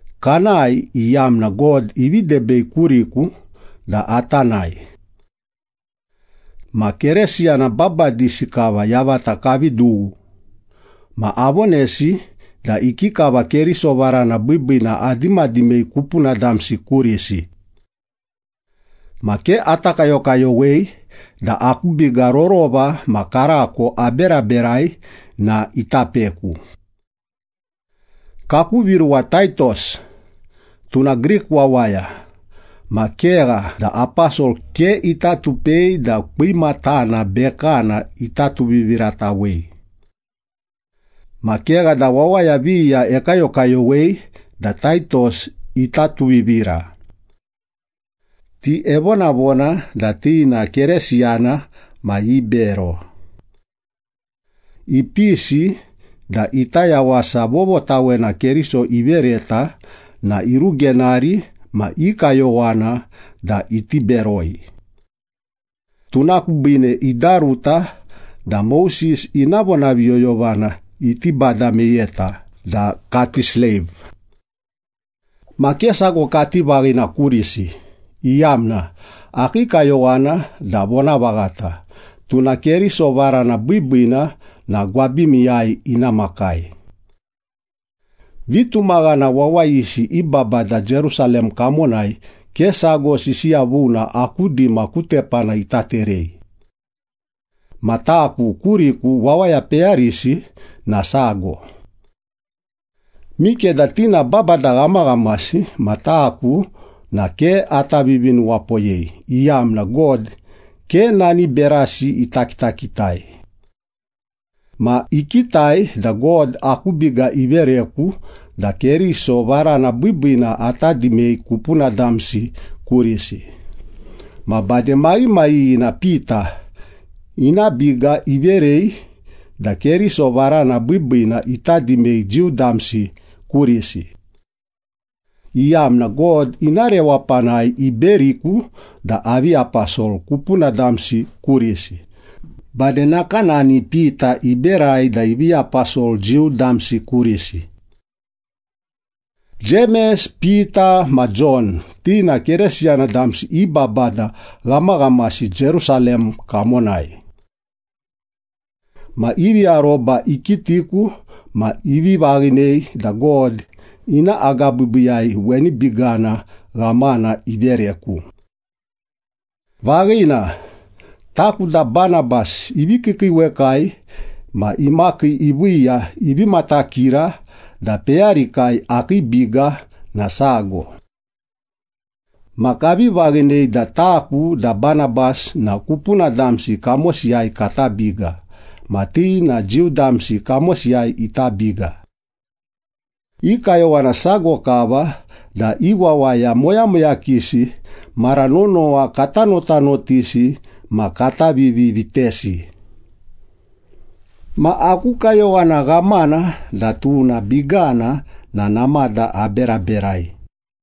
Kanae, iyamna God ivi debei kuriku da ata nae. Ma Keresiyana babadisi kava yavata kavi dughu, ma avonesi da ikikava Keriso varana biibiina adimadimei kupuna damsi kurisi. Ma ke ata kayokayowei da aku biga rorova ma karako aberaberai na ita peku. Kaku viruwa Taitos, tuna Grik wawaya ma kegha da aposol ke ita tupei da kwimatana bekana ita tuviviratawei. Ma kegha da wawaya viya ekayokayowei da Taitos ita tuvivira. Ti evonavona da ti na Keresiyana ma ibero. Ipisi da ita yawasa vovotawena Keriso ivereta na irugenari ma i kayowana da iti beroi. Tuna kubiine idaruta da Moses ina vonaviyoyovana iti bada meyeta da kati sleiv. Ma ke sago kati vaghina kurisi, iyamna akii kayowana da vonavaghata, tuna Keriso varana biibiina na gwabimiyai ina makai. Vitumaghana wawayisi i babada Jerusalem kamonai ke sago sisiya vuna aku dima ku tepana ita terei. Ma taku kuriku wawaya peyarisi na sago. Mikeda ti na babada ghamaghamasi ma taku na ke ata vivinuwapoyei, iyamna God ke nani berasi ita kitakitai. Ma ikitai da God aku biga ivereku da Keriso varana biibiina ata dimei kupuna damsi kurisi, ma bade maghimaghighina Pita ina biga iverei da Keriso varana biibiina ita dimei Jiu damsi kurisi, iyamna God ina rewapanai iberiku da avi aposol kupuna damsi kurisi, bade nakanani Pita iberai da ivi aposol Jiu damsi kurisi. Jemes, Pita ma Jon ti na Keresiyana damsi i babada ghamaghamasi Jerusalem kamonai. Ma ivi aroba ikitiku ma ivi vaghinei da God ina agabiibiiyai weni bigana ghamana ivereku. Vaghina, taku da Banabas ivi kiikiiwekai ma imakii iviiya, ivi matakira da peyarikai akii biga na sago. Ma kavi vaghinei da taku da Banabas na kupuna damsi kamosiyai kata biga, ma ti na Jiu damsi kamosiyai ita biga. I kayowana sago kava, da i wawaya moyamoyakisi mara nonowa kata notanotisi ma kata vivi vitesi. Ma aku kayowana ghamana da tuna bigana na namada aberaberai.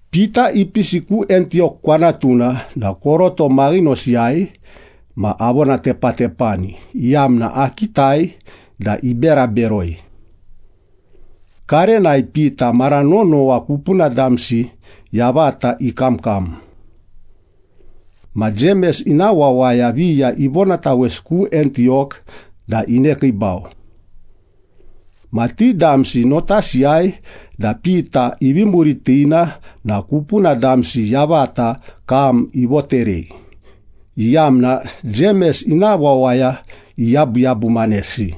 Pita ipisi ku Antiyok kwanatuna na koroto maghinosiyai ma avonatepatepani, iyamna akitai da ibera beroi. Karenai Pita mara nonowa kupuna damsi yavata ikamkam. Ma Jemes ina wawaya viya ivonatawesi ku Antiyok da inekiibau. Ma ti damsi notasiyai da Pita ivi muritina na kupuna damsi yavata kam ivoterei, iyamna Jemes ina wawaya iyabuyabumanesi.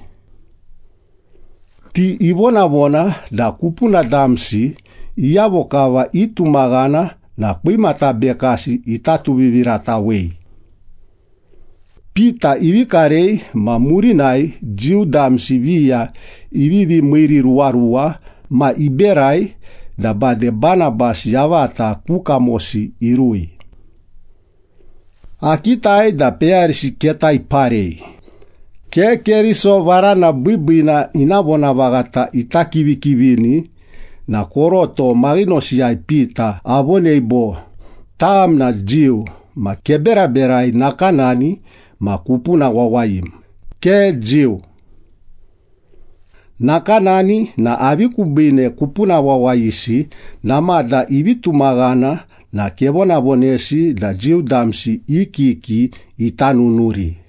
Ti ivonavona da kupuna damsi iyavo kava itumaghana na kwimata bekasi ita tuviviratawei. Pita ivi karei ma murinai Jiu damsi viya ivivi miiriruwaruwa, ma iberai da bade Banabas yavata ku kamosi irui. Akitai da peyarisi keta iparei, ke Keriso varana biibiina ina vonavaghata ita kivikivini na koroto maghinosiyai Pita avonei bo “Tam na Jiu, ma keberaberai nakanani ma kupuna wawayim, ke Jiu. Nakanani na avi kubiine kupuna wawayisi namada ivi tumaghana na kevonavonesi da Jiu damsi i kiki ita nunuri?”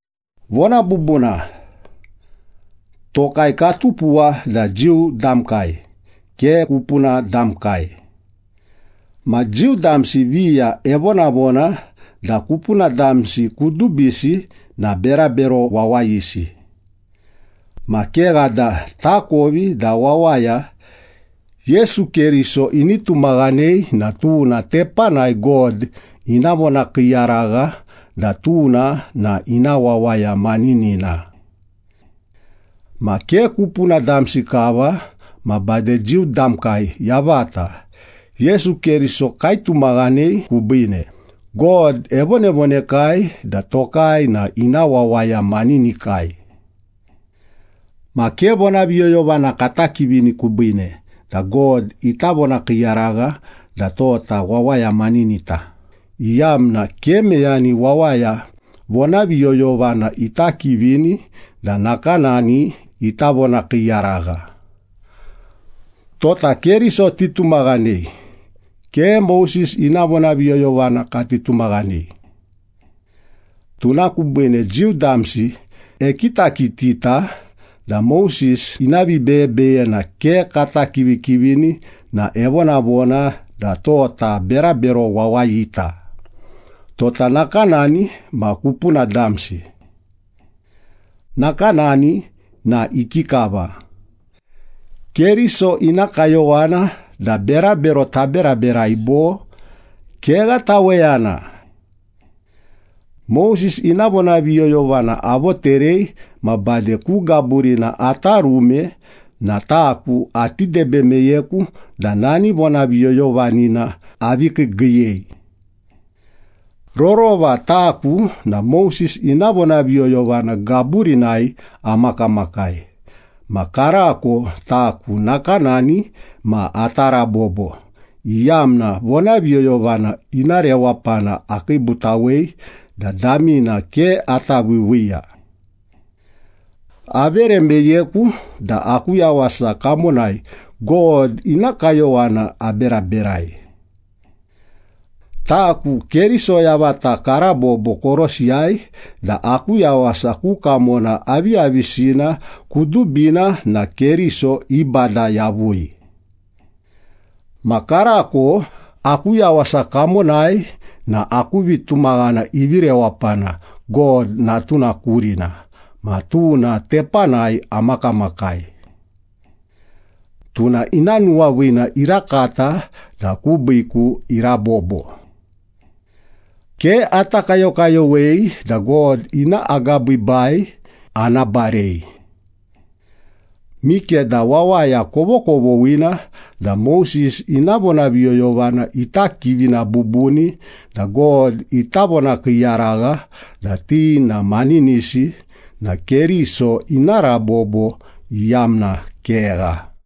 Vona bubuna, tokai katupuwa da Jiu damkai, ke kupuna damkai. Ma Jiu damsi viya evonavona da kupuna damsi kudubisi na ‘berabero wawayisi.’ Ma kegha da takovi da wawaya Yesu Keriso ini tumaghanei na tuna tepanai God ina vonakiiyaragha da tuna na ina wawaya maninina. Ma ke kupuna damsi kava ma bade Jiu damkai yavata Yesu Keriso kaitumaghanei kubiine, God evonavonekai da tokai na ina wawaya maninikai. Ma ke vonaviyoyovana kata kivini kubiine da God ita vonakiiyaragha da tota wawaya maninita, iyamna ke meyani wawaya vonaviyoyovana ita kivini da nakanani ita vonakiiyaragha. Tota Keriso titumaghanei, ke Moses ina vonaviyoyovana kati tumaghanei. Tuna kubiine Jiu damsi ekitakitita da Moses ina vibeyebeyena ke kata kivikivini na evonavona da tota berabero wawayita, tota nakanani ma kupuna damsi. Nakanani na ikikava? Keriso ina kayowana da berabero taberaberai bo? Kegha taweyana! Moses ina vonaviyoyovana avoterei ma bade ku gaburina ata rume na taku ati debe meyeku da nani vonaviyoyovanina avi kiigiiyei. Rorova taku na Moses ina vonaviyoyovana gaburinai amakamakai, ma karako taku nakanani ma ata rabobo, iyamna vonaviyoyovana ina rewapana akiibutawei da damina ke ata viiviiya. Avere meyeku da aku yawasa kamonai God ina kayowana aberaberai. Taku Keriso yavata karabobo korosiyai da aku yawasa ku kamona aviyavisina kudubina na Keriso ibada yavui. Ma karako aku yawasa kamonai na aku vitumaghana ivi rewapana God Natuna kurina ma tuna tepanai amakamakai. Tuna ina nuwaviina irakata da kubiiku irabobo. Ke ata kayokayowei da God ina agabiibai ana barei. Mikeda wawaya kovokovoghina da Moses ina vonaviyoyovana ita kivina bubuni da God ita vonakiiyaragha da ti na maninisi na Keriso ina rabobo iyamna kegha.